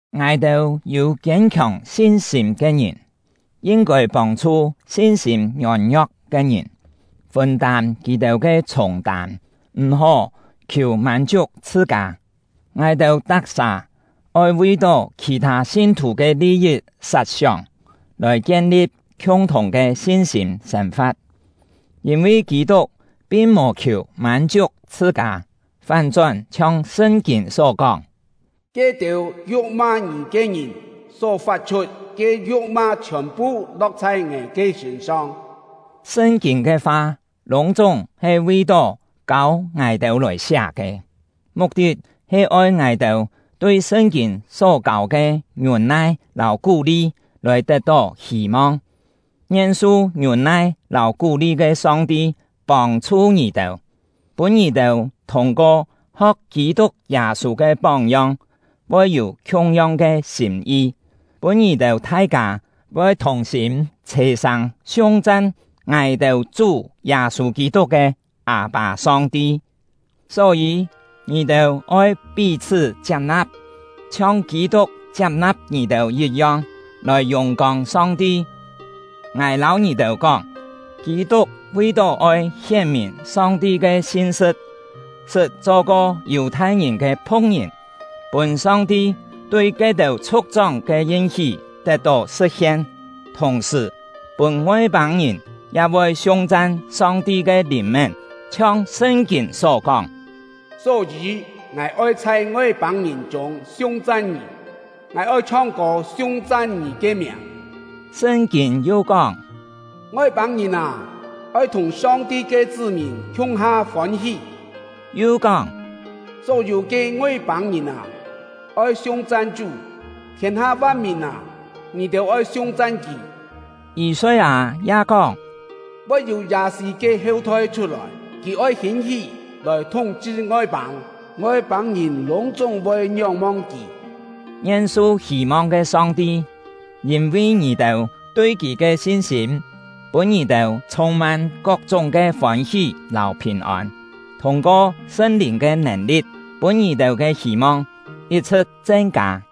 Ngài-têu yû kiên-khiòng sin-sîm ke ngìn yin-kôi pông-chhu sin-sîm ngiôn-ngio̍k ke ngìn, fûn-tâm kì-têu ke chhûng-tâm, m̀-hó khiù mân-chiuk chhṳ-kâ. Ngài-têu tak-sà oi vi-tó khì-thâ sin-thù ke li-yit sat-sióng, lòi kien-li̍p khiung-thùng ke sin-sîm sên-fa̍t. Yîn-vi Kî-tuk pin mò khiù mân-chiuk chhṳ-kâ, fán-chón chhiong Sṳn-kîn só kóng: “Ke-têu yu̍k-ma ngì ke ngìn só fat-chhut ke yu̍k-ma chhiòn-phu lo̍k chhai ngài ke sṳ̂n-song.” Sṳn-kîn ke fa lûng-chúng he vi-tó kâu ngài-têu lòi siá ke, muk-tit he oi ngài-têu tui Sṳn-kîn só kâu ke ngiûn-nai lâu kú-li lòi tet-tó hî-mong. Ngien su ngiûn-nai lâu kú-li ke Song-ti pông-chhu ngì-têu, pûn ngì-têu thûng-ko ho̍k Kî-tuk Yâ-sû ke póng-yong, voi yû khiung-yong ke sîm-yi, pûn ngì-têu thai-kâ voi thùng-sîm chhè-sâng siung-chan ngài-têu Chú Yâ-sû Kî-tuk ke Â-pâ Song-ti. Só-yî, ngì-têu oi pí-chhṳ́ chiap-na̍p, chhiong Kî-tuk chiap-na̍p ngì-têu yit-yong, lòi yùng-kông Song-ti. Ngài lâu ngì-têu kóng, Kî-tuk vi-tó oi hién-mìn Song-ti ke sin-sṳ̍t, sṳt cho-ko Yù-thai-ngìn ke phu̍k-ngìn, pûn Song-ti tui ke-têu chhu̍k-chóng ke yin-hí tet-tó sṳ̍t-hien, thùng-sṳ̀, pûn Ngoi-pâng-ngìn ya voi siung-chan Song-ti ke lìn-mén. Chhiong Sṳn-kîn só kóng: Só-yî, ngài oi chhai Ngoi-pâng-ngìn chûng siung-chan Ngì; ngài oi chhong-kô siung-chan Ngì ke miàng. Sṳn-kîn yu kóng: Ngoi-pâng-ngìn â, oi thùng Song-ti ke chṳ́-mìn khiung-ha fôn-hí. Yu kóng: Só-yû ke Ngoi-pâng-ngìn â, oi siung-chan Chú; thiên-ha van-mìn â, ngì-têu oi siung-chan Kì! Yî-soi-â ya kóng: Voi yû Yâ-sî ke heu-thoi chhut-lòi, kì oi hîn-hí lòi thúng-chhṳ Ngoi-pâng; Ngoi-pâng-ngìn lûng-chúng voi ngióng-mong kì! Ngien su hî-mong ke Song-ti, yîn-vi ngì-têu tui Kì ke sin-sîm, pûn ngì-têu chhûng-mân kok-chúng ke fôn-hí lâu phìn-ôn, thûng-ko Sṳn-Lìn ke nèn-li̍t, pûn ngì-têu ke hî-mong yit-chhṳ̍t chen-kâ.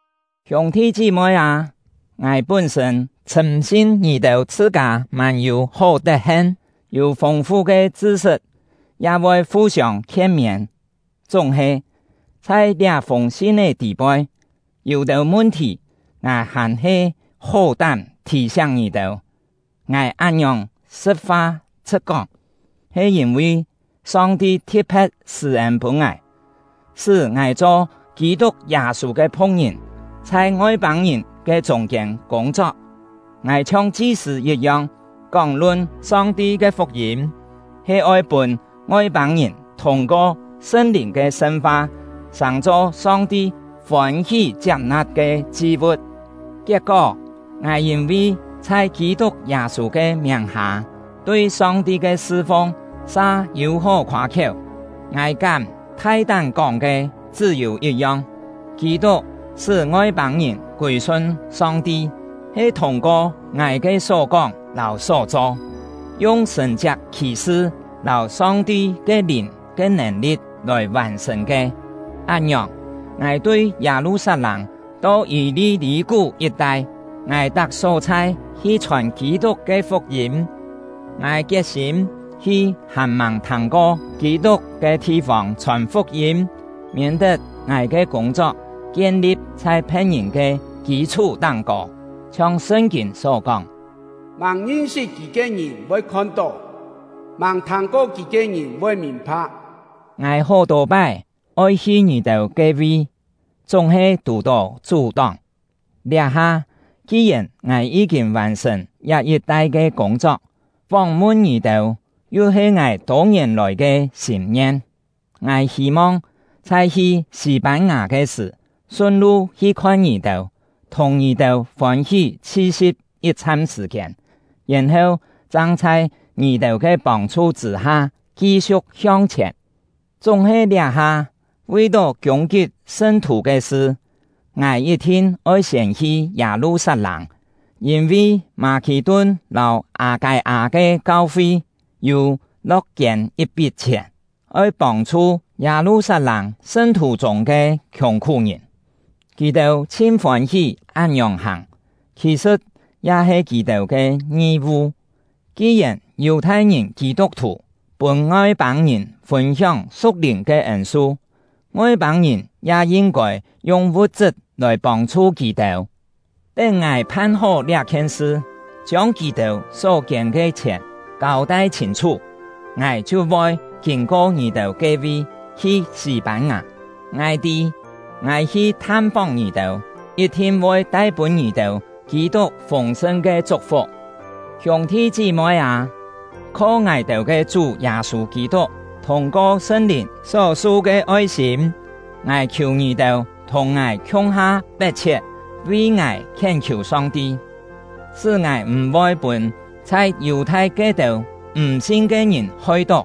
Hiûng-thi chí-moi â, ngài pún-sṳ̂n chhṳ̂m-sin ngì-têu chhṳ-kâ mân-yû hó tet-hen, yû fûng-fu ke chṳ-sṳt, ya voi fu-siông khien-miên. Chúng-he, chhai liá-fûng sin-é tî-poi, yû-têu mun-thì ngài hàn-he hó-tám thì-siáng ngì-têu. Ngài án-ngiòng sṳ̍t-fa chhṳ̍t-kóng, he yîn-vi Song-ti thi̍t-phe̍t sṳ̂-ên pûn ngài, sṳ́ ngài cho Kî-tuk Yâ-sû ke phu̍k-ngìn, chhai Ngoi-pâng-ngìn ke chûng-kiên kûng-chok. Ngài chhiong chi-sṳ̂ yit-yong kóng-lun Song-ti ke fuk-yîm, he oi pûn Ngoi-pâng-ngìn thûng-ko Sṳn-Lìn ke sṳn-fa, sàng-cho Song-ti fôn-hí chiap-na̍p ke chi-vu̍t. Kiet-kó, ngài yîn-vi chhai Kî-tuk Yâ-sû ke miàng-hâ tui Song-ti ke sṳ-fung sa yû hó khoâ-khiéu. Ngài kám thai-tám kóng ke chṳ́-yû yit-yong: Kî-tuk sṳ́ Ngoi-pâng-ngìn kûi-sun Song-ti, he thûng-ko ngài ke só-kóng lâu só-cho, yung sṳ̀n-chiak khì-sṳ lâu Song-ti ke Lìn ke nèn-li̍t lòi vàn-sṳ̀n ke. Án-ngiòng, ngài tui Yâ-lu-sat-lâng to Yî-li-lî-kú yit-tai, ngài tak só-chhai hi chhòn Kî-tuk ke fuk-yîm. Ngài kiet-sîm hi hàn-màng thâng-ko Kî-tuk ke thi-fông chhòn fuk-yîm, miên-tet ngài ke kûng-chok kien-li̍p chhai phe̍t-ngìn ke kî-chhú táng-kô. Chhiong Sṳn-kîn só kóng: Màng ngin-sṳt kì ke ngìn voi khon-tó; màng thâng-ko kì ke ngìn voi mìn-pha̍k. Ngài hó-tô pái oi hi ngì-têu ke-vi, chúng-he tù-tó chú-tóng. Liá-ha, ki-yèn ngài yí-kîn vàn-sṳ̀n liá yit-tai ke kûng-chok, fóng-mun ngì-têu yu he ngài tô-ngièn lòi ke sîm-ngien, ngài hî-mong chhai hi Sî-pân-ngà ke sṳ̀, sun-lu hi khon ngì-têu, thùng ngì-têu fôn-hí chhi-si̍p yit-chham sṳ̀-kiên, yèn-heu chang chhai ngì-têu ke pông-chhu chṳ̂-ha ki-siu̍k hiong-chhièn. Chúng-he liá-ha, vi-tó kiûng-kip sṳn-thù ke sṳ, ngài yit-thin oi siên hi Yâ-lu-sat-lâng. Yîn-vi Mâ-khì-tun lâu Â-kâi-â ke kau-fi yû lo̍k-kiên yit-pit chhièn, oi pông-chhu Yâ-lu-sat-lâng sṳn-thù chûng ke khiùng-khú-ngìn. Kì-têu chhin fôn-hí án-ngiòng hàng, khì-sṳ̍t ya he kì-têu ke ngi-vu: Ki-yèn Yù-thai-ngìn Kî-tuk-thù pûn Ngoi-pâng-ngìn fûn-hióng su̍k-lìn ke ên-su, Ngoi-pâng-ngìn ya yin-kôi yung vu̍t-chṳt lòi pông-chhu kì-têu. Tén ngài phan-hó liá-khien sṳ, chiông kì-têu só kiên ke chhièn kâu-tai chhîn-chhú, ngài chhiu voi kîn-ko ngì-têu ke-vi, hi Sî-pân-ngà. Ngài tî, ngài hi tham-fóng ngì-têu, yit-thin voi tai pûn ngì-têu Kî-tuk fûng-sṳn ke chuk-fuk. Hiûng-thi chí-moi â, kho ngài-têu ke Chú Yâ-sû Kî-tuk, thûng-ko Sṳn-Lìn só-su ke oi-sîm, ngài khiù ngì-têu thùng ngài khiung-ha pet-chhiet vi ngài khién-khiù Song-ti: Sṳ́ ngài m̀-voi pûn chhai Yù-thai ke-têu m̀ sin ke ngìn hoi-tó,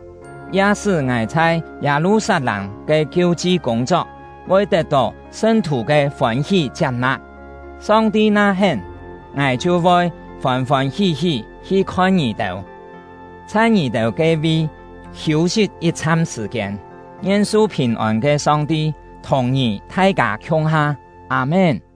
ya sṳ́ ngài chhai Yâ-lu-sat-lâng ke kiu-chi kûng-chok voi tet-tó sṳn-thù ke fôn-hí chiap-na̍p. Song-ti na hén, ngài chhiu voi fôn-fôn hí-hí hi khon ngì-têu, chhai ngì-têu ke-vi hiû-sit yit-chham sṳ̀-kiên. Ngien su phìn-ôn ke Song-ti thùng ngì thai-kâ khiung-ha! Â-mén.